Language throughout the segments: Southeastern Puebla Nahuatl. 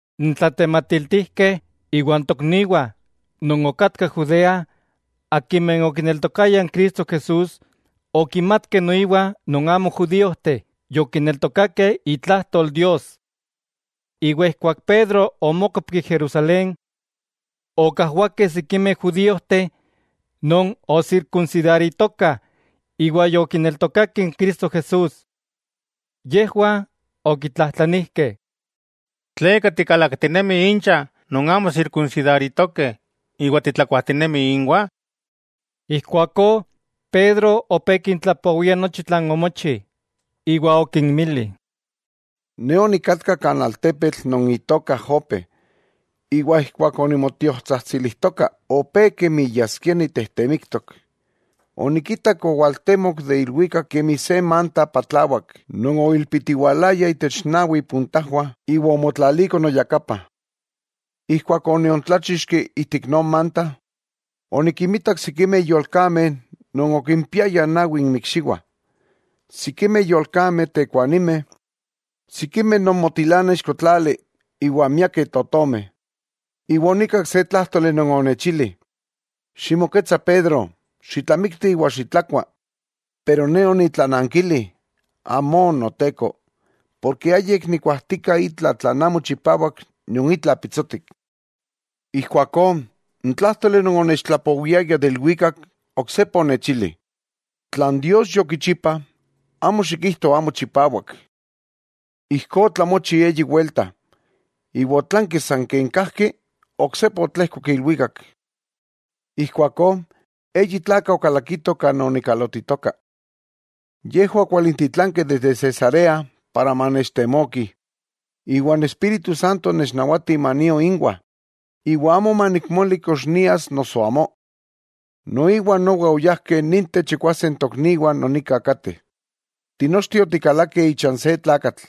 N tlatematiltijkeh iwa n tokniwah non okatkah Judea akimeh okineltokayah n Cristo Jesús okimatkeh noiwa non amo judíojteh yokineltokakeh itlajtol Dios. Iwa ijkuak Pedro omókopki Jerusalén, okajwakeh sikimeh judíojteh non osirkunsidaritokah iwa yokineltokakeh n Cristo Jesús. Yejwah okitlajtlanijkeh: —¿Tleka tikalaktinemi incha non amo sirkunsidaritokeh, iwa titlakuajtinemi inwah? Ijkuakó Pedro opé kintlapowia nochi tlan omochi, iwa okinmili: —Ne onikatka kan altepetl non itoka Jope, iwa ijkuak onimotiotsajtsilijtoka, opé kemi yaskia nitejtemiktok, onikitak owaltemok de ilwikak kemi se manta patlawak non oilpitiwalaya itech nawi ipuntajwah iwa omotlaliko noyakapa. Ijkuak oniontláchixki ijtik non manta, onikinmitak sikimeh yolkameh non okimpiayah nawi inmikxiwah, sikimeh yolkameh tekuanimeh, sikimeh non motilanah ixkotlali iwa miakeh totomeh. Iwa onikak se tlájtoli non onechili: “Ximoketsa Pedro, xitlamikti iwa xitlakua.” Pero Ne onitlanankili: “Amó, Noteko, porke ayik nikuajtika itla tlan amo chipawak nion itla pitsotik.” Ijkuakó n tlájtoli non onechaltlapowiaya de ilwikak, oksepa onechili: “Tlan Dios yokichipa, amo xikijto amo chipawak.” Ijkó otlamochi eyi welta, iwa otlanki san ken kajki oksepa otlejkok ilwikak. Ijkuakó eyi tlakah okalakitoh kan onikalotitoka. Yejwah okwalintitlankeh desde Cesarea para manechtemokih. Iwa n Espíritu Santo onechnawati manio inwah, iwa amo manikmoli kox nias noso amó. Noiwa nowa oyajkeh ninteh chikwase n tokniwah non nika kateh. Tinochteh otikalakeh ichan se tlakatl,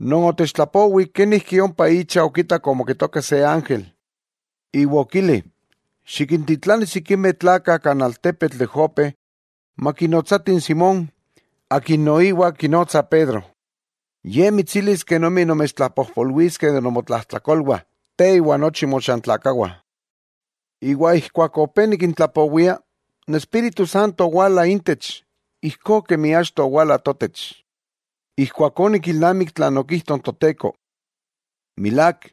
non otechtlapowi kenijki ompa icha okitak omoketoka se ángel, iwa okili: “Xikintitlani sikimeh tlakah kan altepetl de Jope makinotsatih n Simón, akin noiwa kinotsah Pedro, ye mitsilis kenomi nomechtlapojpolwiskeh de nomotlajtlakolwah, te iwa nochi mochantlakawah.” Iwa ijkuak opé nikintlapowia, n Espíritu Santo owala intech, ijkó kemi achto owala totech. Ijkuakó onikilnamik tlan okijto n Toteko: “Milák,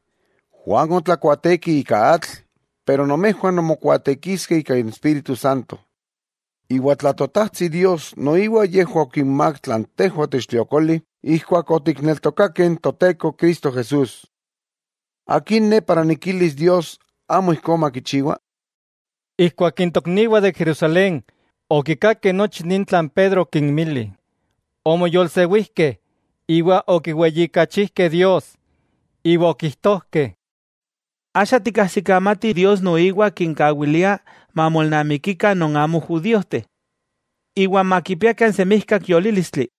Juan otlakuaateki ika atl, pero nomejwah nonmokuaatekiskeh ika n Espíritu Santo.” Iwa tla Totajtsi Dios noiwa yejwah okinmák tlan tejwah otechtliokoli ijkuak otikneltokakeh n Toteko Cristo Jesús, ¿akin ne para nikilis Dios amo ijkó makichiwa? Ijkuak n tokniwah de Jerusalén okikakeh nochi ni tlan Pedro okinmili, omoyolsewijkeh iwa okiweyijkachijkeh Dios, iwa okijtojkeh: —¡Axa tikajsikamatih Dios noiwa kinkawilia mamolnamikikah non amo judíojteh, iwa makipiakah n semijkak yolílistli!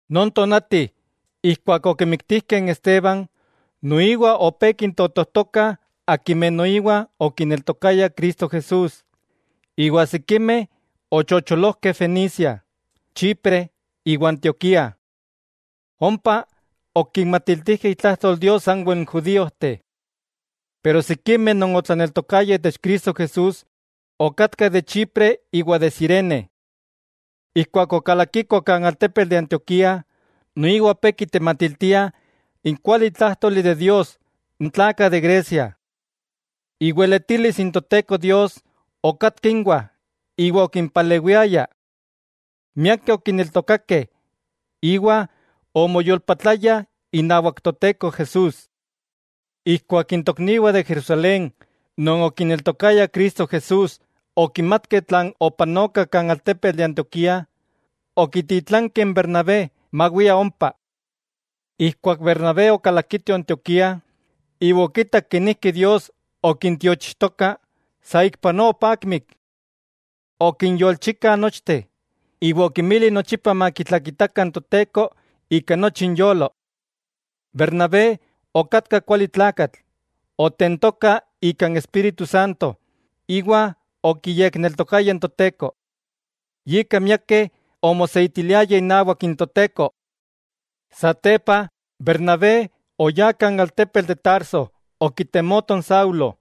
Non tonati ijkuak okimiktijkeh n Esteban, noiwa opé kintotojtokah akimeh noiwa okineltokayah Cristo Jesús, iwa sikimeh ochocholojkeh Fenicia, Chipre iwa Antioquía. Ompa okinmatiltijkeh itlajtol Dios sanwel n judíojteh. Pero sikimeh non otlaneltokayah itech Cristo Jesús okatkah de Chipre iwa de Cirene. Ijkuak okalakikoh kan altepetl de Antioquía noiwa opé kitematiltiah n kualitlájtoli de Dios n tlakah de Grecia. Iweletilis n Toteko Dios okatka inwah iwa okimpalewiaya. Miakeh okineltokakeh iwa omoyolpatlayah inawak Toteko Jesús. Ijkuak n tokniwah de Jerusalén non okineltokayah Cristo Jesús okimatkeh tlan opanotoka kan altepetl de Antioquía, okititlankeh n Bernabé mawia ompa. Ijkuak Bernabé okalakito Antioquía iwa okitak kenijki Dios okintiochijtoka, saikpanoa opakmik. Okinyolchika nochteh, iwa okinmili nochipa makitlakitakah n Toteko ika nochi inyolo. Bernabé okatka kuali tlakatl, otentoka ika n Espíritu Santo iwa okiyekneltokaya n Toteko. Yika miakeh omoseitiliayah inawak n Toteko. Satepa, Bernabé oyá kan altepetl de Tarso okitemoto n Saulo,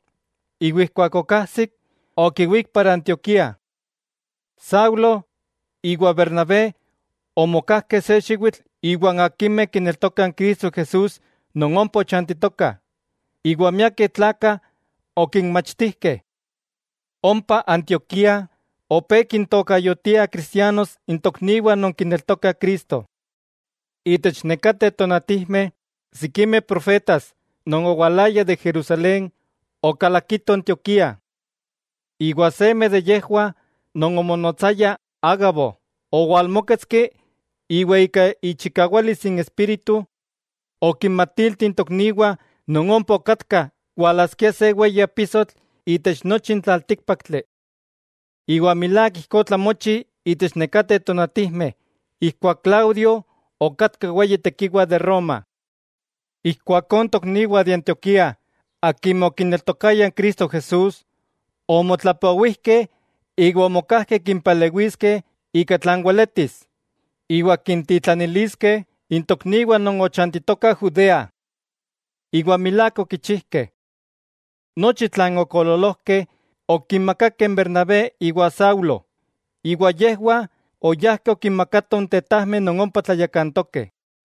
iwa ijkuak okajsik, okiwík para Antioquía. Saulo iwa Bernabé omokajkeh se xiwitl iwan akimeh kineltokah n Cristo Jesús non ompa ochantitokah, iwa miakeh tlakah okinmachtijkeh. Ompa Antioquía opé kintokayotiah cristianos n tokniwah non kineltokah Cristo. Itech nekateh tonatijmeh sikimeh profetas non owalayah de Jerusalén okalakitoh Antioquía. Iwa seme de yejwah non omonotsaya Ágabo, owalmóketski iwa ika ichikawalis n Espíritu okinmatilti n tokniwah non ompa okatkah walaskia se weyi apisotl itech nochi n tlaltíkpaktli. Iwa milák ijkó otlamochi itech nekateh tonatijmeh ijkuak Claudio okatka weyi tekiwa de Roma. Ijkuakó n tokniwah de Antioquía akimeh okineltokayah n Cristo Jesús, omotlapowijkeh iwa omokajkeh kimpalewiskeh ika tlan weletis, iwa kintitlaniliskeh n tokniwah non ochantitokah Judea. Iwa milák okichijkeh. Nochi tlan okoololojkeh, okimakakeh n Bernabé iwa Saulo, iwa yejwah oyajkeh okinmakatoh n tetajmeh non ompa tlayakantokeh.